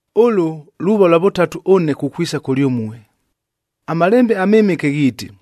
Ʉlʉ luuva lwa vʉtatu ʉne kukwisa kʉlyʉmue. AMalembe aMɨmɨke ghiiti,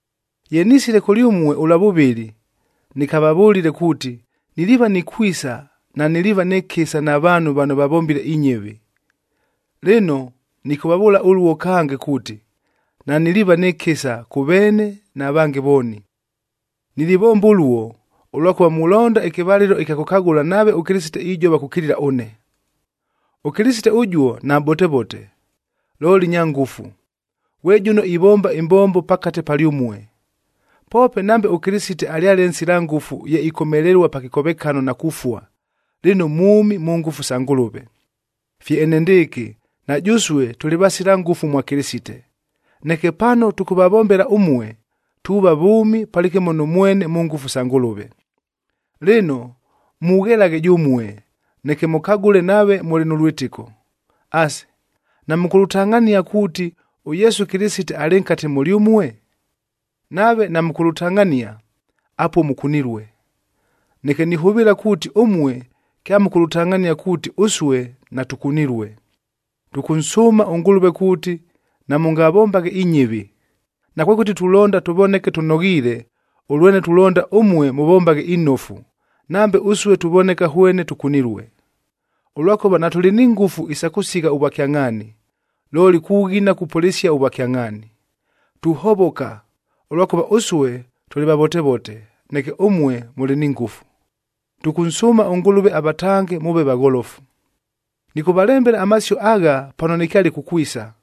Ye nisile kʉlyʉmue ʉlwa vʉvɨlɨ, nɨkavavʉlile kuuti, niliiva nikwisa naniliiva nɨ kɨsa na vaanhu vano vavombile inyɨvi. Lɨno, nɨkʉvavʉʉla ʉluo kange kuuti, naniliiva nɨ kɨsa kʉ veene na vange vooni. Nilivomba ʉluo, ʉlwakʉva mulonda ɨkɨvalɨlo ɨkya kʉkagʉla nave ʉKɨlɨsite ijova kukilila ʉne. ɄKɨlɨsite ʉjuo namʼbotevote, looli nya ngʉfu, ghwe jʉno ivomba ɨmbombo pakate palyʉmue. Poope nambe ʉKɨlɨsite alyale nsila ngʉfu ye ikomelelua pa kɨkovekano na kufua, lɨno mwʉmi mʉ ngʉfu sa Ngʉlʉve. Fye enendɨɨkɨ, na jʉsue tʉlɨ vasila ngʉfu mwa Kɨlɨsite, neke pano tʉkʉvavombela ʉmue, tuuva vʉʉmi palɨkɨmo nʉ mwene mʉ ngʉfu sa Ngʉlʉve. Lɨno, mughelaghe jʉmue, neke mʉkagʉle nave mʉlɨ nʉ lwɨtɨko. Asi, namʉkʉlʉtangʼhania kuuti, ʉYesu Kɨlɨsite alɨ nkate mʉlyʉmue? Nave namʉkʉlʉtangʼhania, apuo mʉkunilue. Neke nihʉvɨɨla kuuti ʉmue kyamʉkʉlʉtangʼhania kuuti ʉsue natʉkunilue. Tʉkʉnsʉʉma ʉNgʉlʉve kuuti namʉngavombaghe inyɨvi. Nakwekʉti tulonda tʉvoneke tʉnoghiile, ʉlwene tulonda ʉmue mʉvombaghe inofu, nambe ʉsue tuvoneka hwene tʉkunilue. Ʉlwakʉva natʉlɨ ni ngʉfu isa kʉsigha ʉvwakyangʼhaani, looli kughina kupʉlɨsia ʉvwakyangʼhaani. Tuhovoka, ʉlwakʉva ʉsue tʉlɨ vavotevote, neke ʉmue mʉlɨ ni ngʉfu. Tʉkʉnsʉʉma ʉNgʉlʉve avatange mʉʉve vagholofu. Nɨkʉvalembela amasio agha pano nɨkyale kukwisa,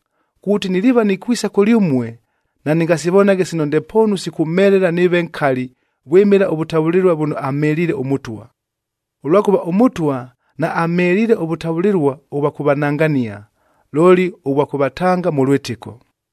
kuuti niliiva nikwisa kʉlyʉmue, nanɨngasivonaghe sino ndepoonu sikʉmhelela nɨɨve nkali vwɨmɨla ʉvʉtavʉlɨlua vʉno amheliile ʉMʉtwa. Ʉlwakʉva ʉMʉtwa naamheliile ʉvʉtavʉlɨlua ʉvwa kʉvanangania, looli ʉvwa kʉvatanga mʉ lwɨtɨko.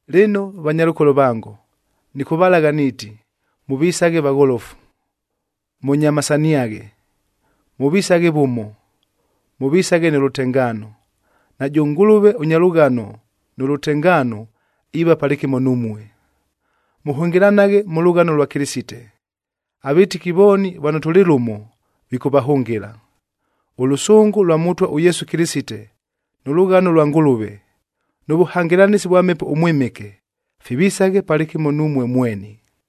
Lɨno vanyalʉkolo vango, nɨkʉvalagha niiti, mʉvisaghe vagholofu, mʉnyamasaniaghe, mʉvisaghe vʉmo, mʉvisaghe nʉ lʉtengaano. Najʉ Ngʉlʉve ʉnya lʉghano nʉ lʉtengaano iiva palɨkɨmo numue. Mʉhʉngɨlanaghe mʉ lʉghano lwa Kɨlɨsite. Avɨtɨki vooni vano tʉlɨ lʉmo, vikʉvahʉngɨla. Ʉlʉsʉngʉ lwa Mʉtwa ʉYesu Kɨlɨsite, nʉ lʉghano lwa Ngʉlʉve, nʉ vʉhangɨlanɨsi vwa Mhepo ʉMwɨmɨke, fivisaghe palɨkɨmo numue mweni.